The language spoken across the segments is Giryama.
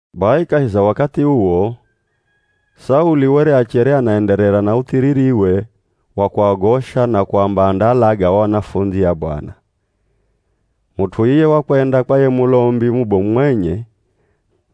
Bai kahi za wakathi uwo, Sauli were achere anaenderera na uthiririwe wa kuagosha na kuamba andaalaga o anafundzi a Bwana. Mut'u iye wakwenda kwa ye Mulombi mubomu mwenye,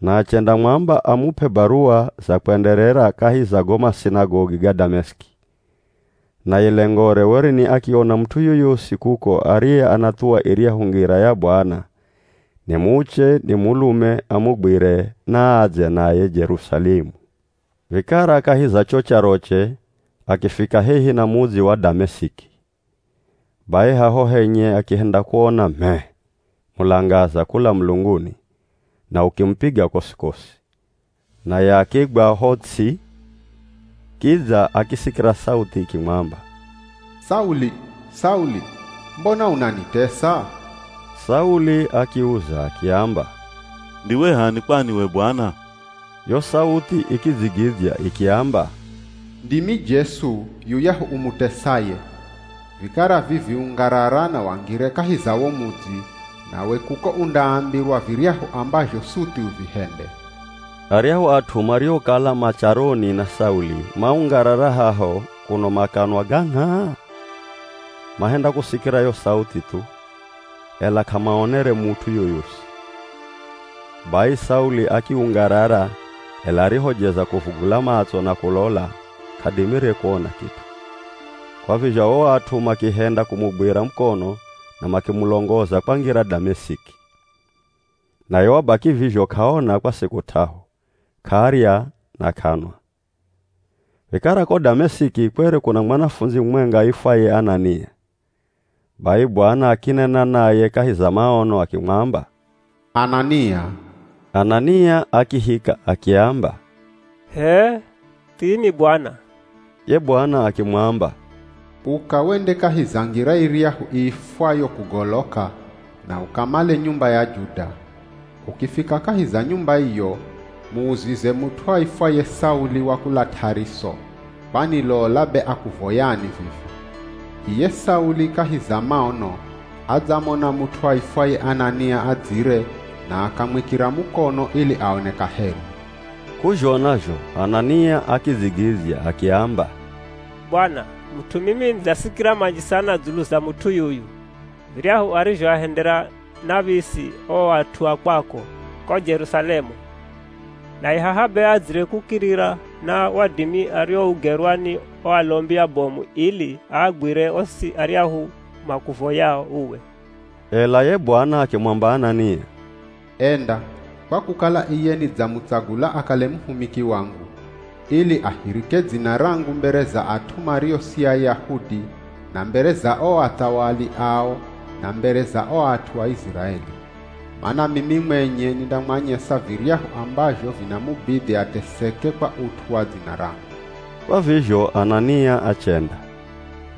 na achendamwamba amup'e baruwa za kwenderera kahi za go masinagogi ga Damesiki. Naye lengore were ni akiona mut'u yoyosi kuko ariye anathuwa iryahu Ngira ya Bwana, ni muche ni mulume, amugwire naadze naye Jerusalemu. Vikara kahi za cho charoche akifika hehi na mudzi wa Damesiki. Bai haho henye akihenda kuona m'e, mulangaza kula mulunguni, na ukimupiga kosi-kosi. Naye akigwa ho ts'i, kidza akisikira sauthi ikimwamba, “Sauli! Sauli! Mbona unanitesa?” Sauli akiuza akiamba, “Ndiwe h'ani kwani we Bwana?” Yo sauthi ikidzigidzya ikiamba, “Ndimi Jesu, yuyahu umutesaye. Vikara vivi ungarara na wangire kahi za wo mudzi, nawe kuko undaambirwa viryahu ambazho suthi uvihende.” Aryahu at'u mariokala ma charoni na Sauli maungarara haho kuno makanwa ga ngh'aa. Mahenda kusikira yo Sauthi thu, ela k'amaonere mut'u yoyosi. Bai Sauli akiungarara, ela arihojeza kuvugula matso na kulola, k'adimire kuona kit'u. Kwa vizho o at'u makihenda kumugwira mukono na makimulongoza kwangira Damesiki. Naye wabaki vizho k'aona kwa siku t'ahu, k'arya na k'anwa. Vikara ko Damesiki kwere kuna mwanafundzi mumwenga aifwaye Anania. Bai Bwana akinena naye kahi za maono akimwamba, “Anania!” Anania akihika akiamba, “H'ee, thimi Bwana.” Ye Bwana akimwamba, “Uka wende kahi za ngira iryahu iifwayo ‘Kugoloka’ na ukamale nyumba ya Juda. Ukifika kahi za nyumba iyo, muuzize mut'u aifwaye Sauli wa kula T'ariso, kwani lola be akuvoyani vivi. Iye Sauli kahi za maono adzamona mut'u aifwaye Anania adzire na akamwikira mukono ili aone kaheri.” K'uzhona zho Anania akidzigidzya akiamba, “Bwana, mut'u mimi nidzasikira manji sana dzulu za mut'u yuyu, viryahu arizhoahendera nav̱isi o at'u a kwako ko Jerusalemu. Naye haha be adzire kukirira na wadimi ariougerwa ni o alombi abomu ili aagwire osi aryahu makuvoyao uwe.” Ela ye Bwana akimwamba Anania, “Enda, kwa kukala iye nidzamutsagula akale muhumiki wangu, ili ahirike dzina rangu mbere za at'u mario si Ayahudi na mbere za o athawali ao na mbere za o at'u a Iziraeli. Mana mimi mwenye nindamwanyesa viryahu ambazho vindamubidhi ateseke kwa ut'u wa dzina rangu.” Kwa vizho Anania achenda.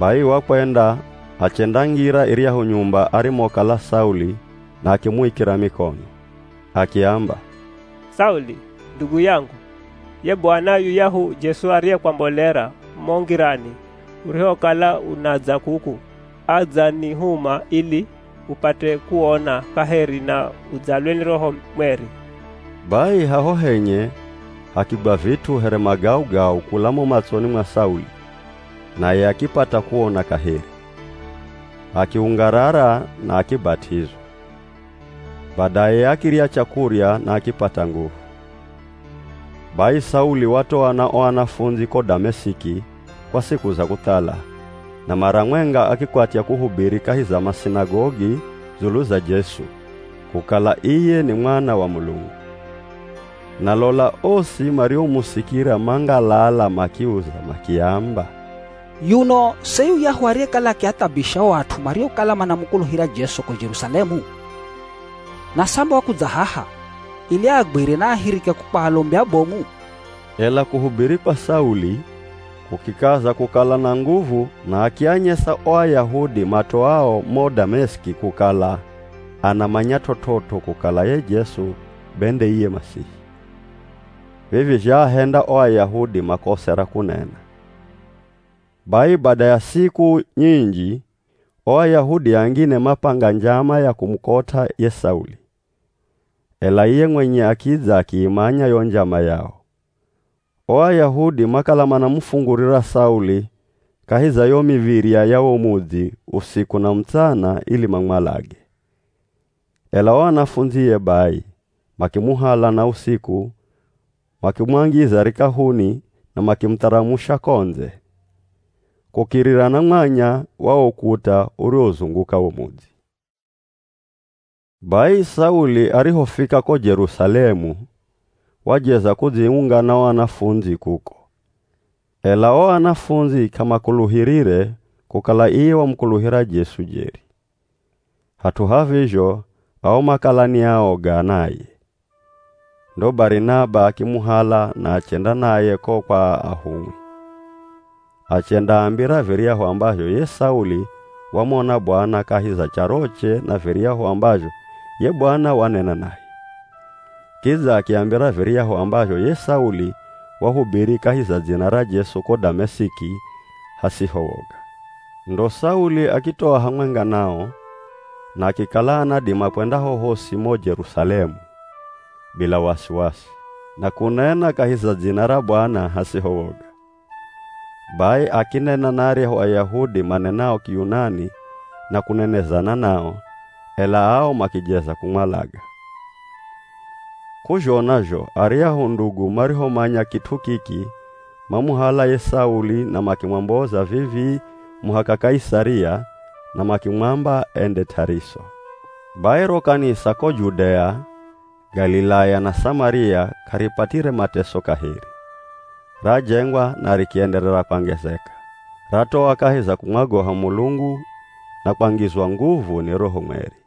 Bai wakwenda achendangira iryahu nyumba arimokala Sauli na akimuikira mikono, akiamba, “Sauli, ndugu yangu. Ye Bwana, yuyahu Jesu ariyekwambolera mo ngirani urihokala unadza kuku, adzanihuma ili upate kuona kaheri na udzalwe ni Roho Mweri.” Bai haho henye hakigwa vit'u here magaugau kula mo matsoni mwa Sauli naye akipata kuona kaheri, akiungarara na akibat'izwa. Badaye akirya chakurya na akipata nguvu. Bai Sauli watoa na o anafundzi ko Damesiki kwa siku za kuthala, na mara mwenga akikwatya kuhubiri kahi za masinagogi dzulu za Jesu, kukala iye ni Mwana wa Mulungu. Na lola osi mariomusikira mangalala makiuza makiamba, “Yuno se yuyahu ariyekala akiathabisha o at'u mariokala manamukuluhira Jesu ko Jerusalemu? Na samba wakudza haha ili aagwire na aahirike ko kwa alombi abomu?” Ela kuhubiri kwa Sauli, kukikaza kukala na nguvu na akianyesa o Ayahudi matoao mo Damesiki kukala anamanya t'ot'ot'o kukala ye Jesu be nde iye Masihi. Vivi zhaahenda o Ayahudi makose ra kunena. Bai bada ya siku nyinji, o Ayahudi angine mapanga njama ya kumukot'a ye Sauli. Ela iye mwenye akidza akiimanya yo njama yao. O Ayahudi makala manamufungurira Sauli kahi za yo miv̱irya ya wo mudzi usiku na mutsana ili mamwalage. Ela o anafundzie bai, makimuhala na usiku makimwangiza rikahuni na makimutharamusha ko ndze kukirira na mwanya wa wo ukuta uriwozunguka wo mudzi. Bai Sauli arihofika ko Jerusalemu, wajeza kudziunga na o anafundzi kuko, ela o anafundzi k'amakuluhirire kukala iye wamukuluhira Jesu jeri. Hat'u ha vizho, ao makala ni aoga naye. Ndo Barinaba akimuhala na achenda naye ko kwa ahumwi. Achendaambira viryahu ambazho ye Sauli wamona Bwana kahi za charoche na viryahu ambazho ye Bwana wanena naye. Kidza akiambira viryahu ambazho ye Sauli wahubiri kahi za dzina ra Jesu ko Damesiki hasiho woga. Ndo Sauli akitoa hamwenga nao na akikala anadima kwenda hohosi mo Jerusalemu bila wasiwasi, na kunena kahi za dzina ra Bwana hasiho woga. Bai akinena na aryahu Ayahudi manenao Kiyunani na kunenezana nao, ela ao makijeza kumwalaga. K'uzhona zho aryahu ndugu marihomanya kit'u kiki mamuhala ye Sauli na makimwomboza vivii muhaka Kaisaria na makimwamba ende T'ariso. Bai ro kanisa ko Judea, Galilaya na Samaria k'aripatire mateso kaheri, rajengwa na rikienderera kwangezeka. Ratoa kahi za kumwagoha Mulungu na kwangizwa nguvu ni Roho Mweri.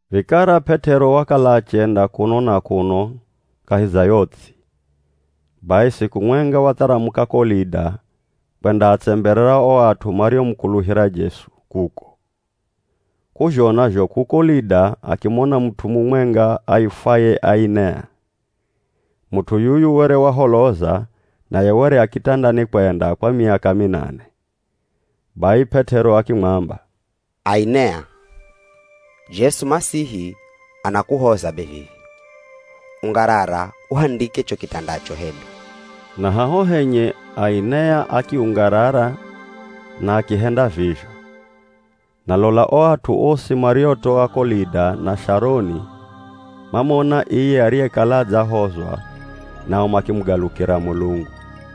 Vikara P'et'ero wakala achenda kuno na kuno kahi za yo ts'i. Bai siku mwenga watharamuka ko Lida kwendaatsemberera o at'u mariomukuluhira Jesu kuko. K'uzhona zho kuko Lida akimona mut'u mumwenga aifwaye Ainea. Mut'u yuyu were waholoza naye were a kitandani kwenda kwa miaka minane. Bai P'et'ero akimwamba, “Ainea, Jesu Masihi anakuhoza be vivi. Ungarara uhandike cho kitandacho hedu.” Na haho henye Ainea akiungarara na akihenda vizho. Na lola o at'u osi mariotoa ko Lida na Sharoni mamona iye ariyekala adzahozwa nao makimugalukira Mulungu.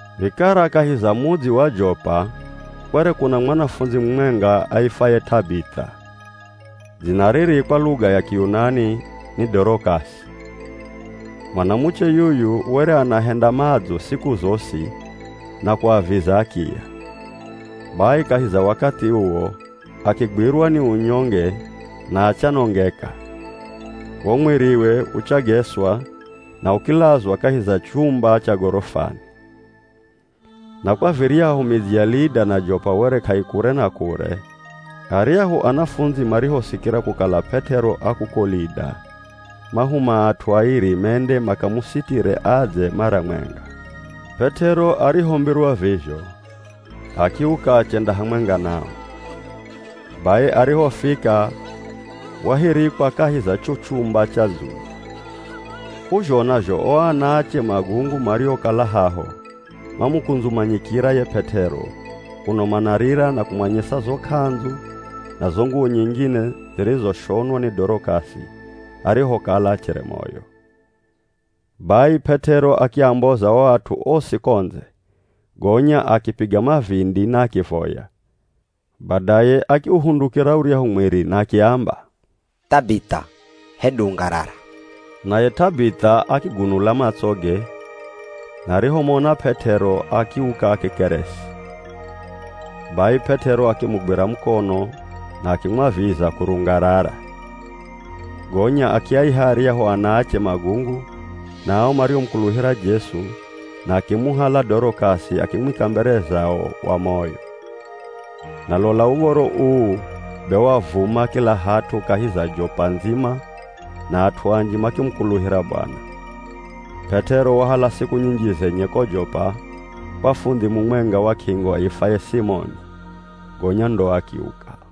Vikara kahi za mudzi wa Jopa kwere kuna mwanafundzi mumwenga aifwaye T'abith'a. (Dzina riri kwa luga ya Kiyunani ni Dorok'asi.) Mwanamuche yuyu were anahenda madzo siku zosi na kuaviza akiya. Bai kahi za wakathi uwo akigwirwa ni unyonge na achanongeka, wo mwiriwe uchageswa na ukilazwa kahi za chumba cha gorofani. Na kwa viryahu midzi ya Lida na Jopa were k'aikure na kure, aryahu anafundzi marihosikira kukala P'et'ero a kuko Lida, mahuma at'u airi mende makamusitire adze mara mwenga. P'et'ero arihombirwa vizho akiuka achenda hamwenga nao. Bai arihofika wahirikwa kahi za cho chumba cha dzulu. K'uzhona zho o anaache magungu mariokala haho mamukundzumanyikira ye P'et'ero kuno manarira na kumwanyesa zo k'andzu na zo nguwo nyingine zirizoshonwa ni Dorok'asi arihokala achere moyo. Bai P'et'ero akiamboza o at'u osi ko ndze gonya akipiga mavindi na akivoya, badaye akiuhundukira uryahu mwiri na akiamba, “T'abith'a, hedu ungarara!” Naye T'abith'a akigunula matsoge na arihomona P'et'ero akiuka akikeresi. Bai P'et'ero akimugwira mukono na akimwaviza kurungarara. Gonya akiaiha aryahu anaache magungu na ao mariomukuluhira Jesu na akimuhala Dorok'asi akimwika mbere zao wa moyo. Na lola uv̱oro uu be wavuma kila hat'u kahi za Jopa ndzima na at'u anji makimukuluhira Bwana. P'et'ero wahala siku nyinji zenye ko Jopa, kwa fundhi mumwenga wa k'ingo aifwaye Simoni, gonya ndo akiuka.